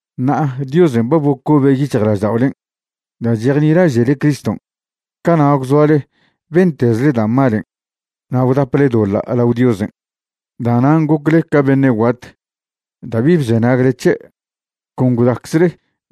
Ṉa'a Diosen' ba bocobe' yic̱hjla'ažda'olen' da' chejnilaže'le Criston'. Cana' gwzoale bentezle da' malen' na' gwdaple doḻa' lao Diosen'. Da'nan' gocle ca beṉe' guat da' bi bzenagle c̱he'. Con gwdaczle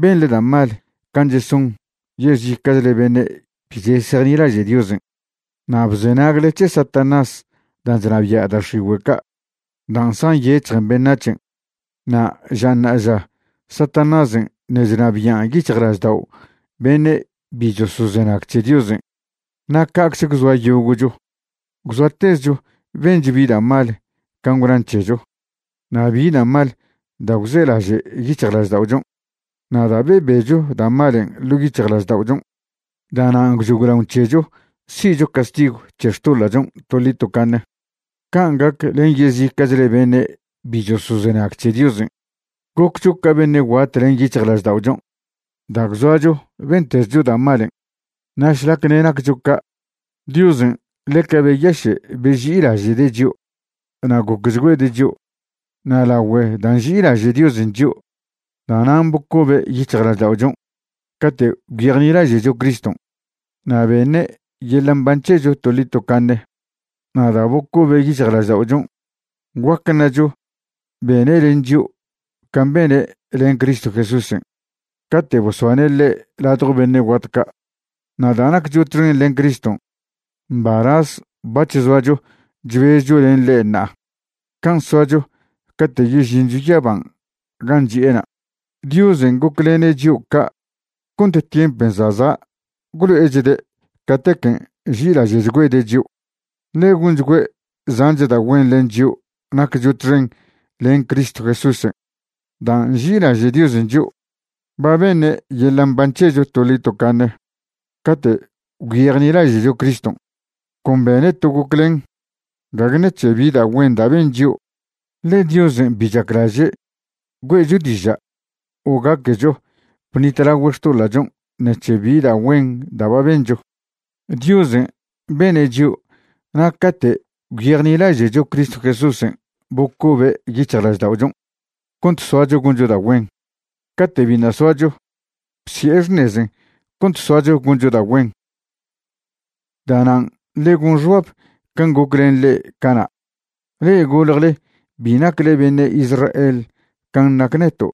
benḻe da' mal can' cheson yezica'chle beṉe' bi chesejnilaže' Diosen', na' bzenagle c̱he Satanás dan' chnabia' da' x̱igüe' ca' dan' zjanyec̱hjen beṉac̱hen'. Na' ža ṉa'aža Satanásen' ṉe' chnabian' yic̱hjlaždao' beṉe' bi chosozenag c̱he Diosen'. Na' ca'cze gwzoa yogo'cho, gwzoatezcho bencho bi da' mal can' gwnan c̱hecho na' bi da' mal da' gwzelaže' yic̱hjlažda'ochon'. Na' da' bebecho da' malen' ḻo' yic̱hjlažda'ochon', da'nan' gwchoglaon c̱hecho si'cho castigw c̱he xtoḻa'chon' toḻi tocaṉe, can' gac len yezica'chle beṉe' bi chosozenag c̱he Diosen'. Goccho ca beṉe' guat len yic̱hjlažda'ochon' da' gwzoacho bentezcho da' malen'. Na' šlac ṉe' naccho ca', Diosen' ḻeca beyaše' beži'ilaže'de' chio' na' gocchgüede' chio'. Na' lagüe da' nži'ilaže' Diosen' chio', da'nan' bocobe' yic̱hjlažda'ochon' cate' gwyejnilaže'cho Criston', na' beṉe' yeḻa' mban c̱hecho toḻi tocaṉe. Na' da' bocobe' yic̱hjlažda'ochon', guac ṉacho bene' len chio' can' bene' len Cristo Jesúsen' cate' bosbane' ḻe' ladjo beṉe' guat ca'. Na' da' naccho txen len Criston', mbalaz bac̱h zoacho chbezcho len ḻe' ṉa'a can' soacho cate' yežincho yaban' gan' chi'ena'. Diosen' goclene' chio' ca' cont tiempen' za' za' gwlo'echde' catequen' nži'ilaže'chgüede' chio', ḻe gonchgüe' zanch da' güen len chio' naccho txen len Cristo Jesúsen'. Da' nži'ilaže' Diosen' chio', ba beṉe' yeḻa' mban c̱hecho toḻi tocaṉe cate' gwyejnilaže'cho Criston'. Con bene' to goclen, gague ṉec̱he bi da' güen da' ben chio'. Ḻe Diosen' bi chaclaže' güe'cho diža' o gaquecho bṉitlagüe' xtoḻa'chon' ṉec̱he bi da' güen da' ba bencho. Diosen' bene' chio' na' cate' gwyejnilaže'cho Cristo Jesúsen' bocobe' yic̱hjlažda'ochon' cont soacho goncho da' güen. Cate' biṉa' soacho, bsi'e xṉezen cont soacho goncho da' güen. Da'nan' ḻe gon xbab can' goc len le'e cana', le'e goljle bi nacle beṉe' Israel can' nac neto'.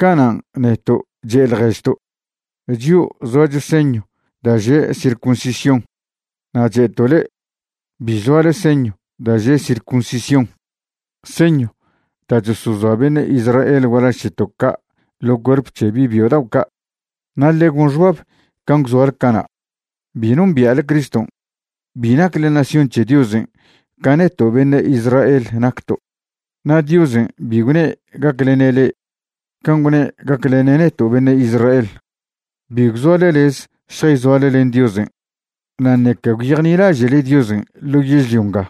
Canan' neto' che' ḻježto': “Chio' zoacho señw da' že' circuncisión”, na' che'to' le'e: “Bi zoale señw da' že' circuncisión” (señw da' chosozoa beṉe' Israel gualaž c̱heto' ca' ḻo cuerp c̱he bi' byo dao' ca'). Na' ḻe gon xbab can' gwzoale cana', bi nombia'le Criston', bi nacle nación c̱he Diosen' ca neto' beṉe' Israel nacto', na' Diosen' bi gwne' gaclene' le'e can' gwne' gaclene' neto' beṉe' Israel. Bi gwzoale lez šjayzoale len Diosen' na' ṉeca gwyejnilaže'le Diosen' ḻo yežlio nga.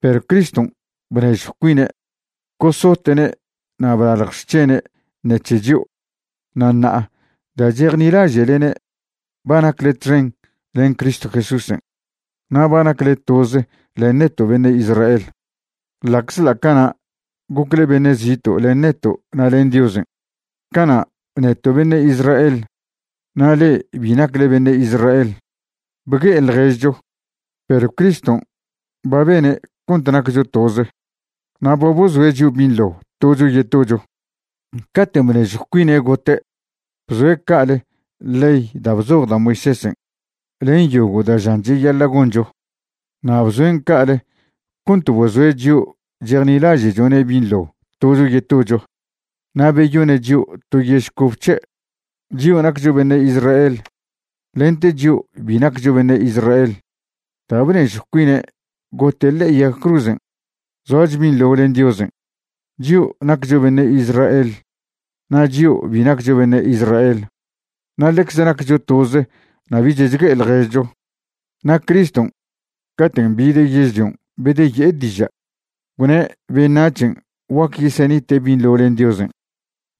Perw Criston' bnežjw cuine' gosote'ne' na' blalj xc̱hene' ṉec̱he chio'. Na' ṉa'a da' chejnilaže'lene' ba nacle txen len Cristo Jesúsen'. Na' ba nacle toze len neto' beṉe' Israel, ḻa'czḻa' cana' gocle beṉe' zito' len neto' na' len Diosen'. Cana' neto' beṉe' Israel na' le'e bi nacle beṉe' Israel bgue'e ḻježcho. Perw Criston' ba bene' cont naccho toze na' ba bozoe' chio' binḻo tocho yetocho. Caten' bnežjw cuine' gote', bzoe' ca'ale ley da' bzoj da' Moisésen' len yogo' da' žan cheyaḻa' goncho. Na' bzoen' ca'ale cont bozoe' chio' chejnilaže'chone' binḻo tocho yetocho na' beyone' chio' to yež cobe c̱he', chio' naccho beṉe' Israel lente chio' bi naccho beṉe' Israel. Da' bnežjw cuine' gote' ḻe'e yag cruzen', zoacho binḻo len Diosen', chio' naccho beṉe' Israel na' chio' bi naccho beṉe' Israel, na' ḻecze naccho toze na' bich chgue'e ḻježcho. Na' Criston' caten' bide' yežlion' bedeye'e diža', gwne' beṉac̱hen' guac yesenite' binḻo len Diosen',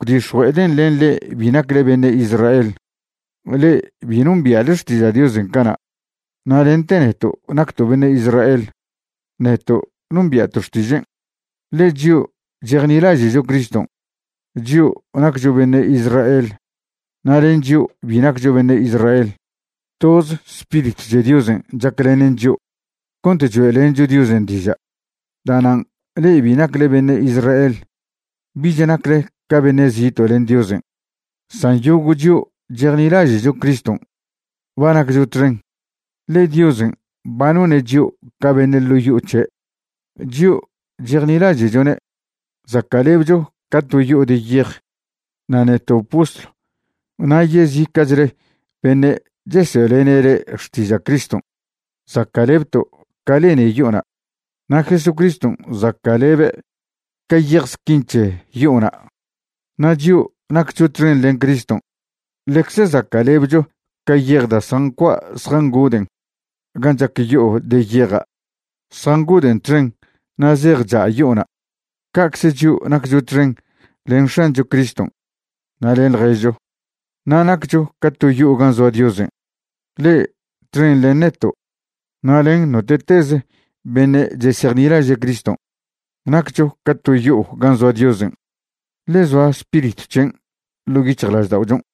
gwdix̱jue'eden' len le'e bi nacle beṉe' Israel, le'e bi nombia'le xtiža' Diosen' cana', na' lente neto' nacto' beṉe' Israel, neto' nombia'to' xtižen'. Ḻe chio' chejnilaže'cho Criston', chio' naccho beṉe' Israel na' len chio' bi naccho beṉe' Israel, toz Spiritw c̱he Diosen' chaclenen chio' cont choe'lencho Diosen' diža'. Da'nan' le'e bi nacle beṉe' Israel bich nacle ca beṉe' zito' len Diosen'. San yogo' chio' chejnilaže'cho Criston' ba naccho txen, ḻe Diosen' ba none' chio' ca beṉe' ḻo' yo'o c̱he'. Chio' chejnilaže'chone' zaca'lebcho ca to yo'o de yej. Na' neto' postlw na' yezica'chle beṉe' chesoe'lene' le'e xtiža' Criston' zaca'lebto' ca lene yo'ona'. Na' Jesucriston' zaca'lebe' ca yej squin c̱he yo'ona'. Na' chio' naccho txen len Criston' ḻecze zaca'lebcho ca yej da' zjancua' zjangoden' gan' chac yo'o de yeja'. Zjangoden' txen na' zej cha' yo'ona'. Ca'cze chio' naccho txen len X̱ancho Criston' na' len ḻježcho, na' naccho ca to yo'o gan' zoa Diosen'. Le'e txen len neto' na' len note'teze beṉe' chesejnilaže' Criston' naccho ca to yo'o gan' zoa Diosen', ḻe zoa Spiritw c̱hen' ḻo' yic̱hjlažda'ochon'.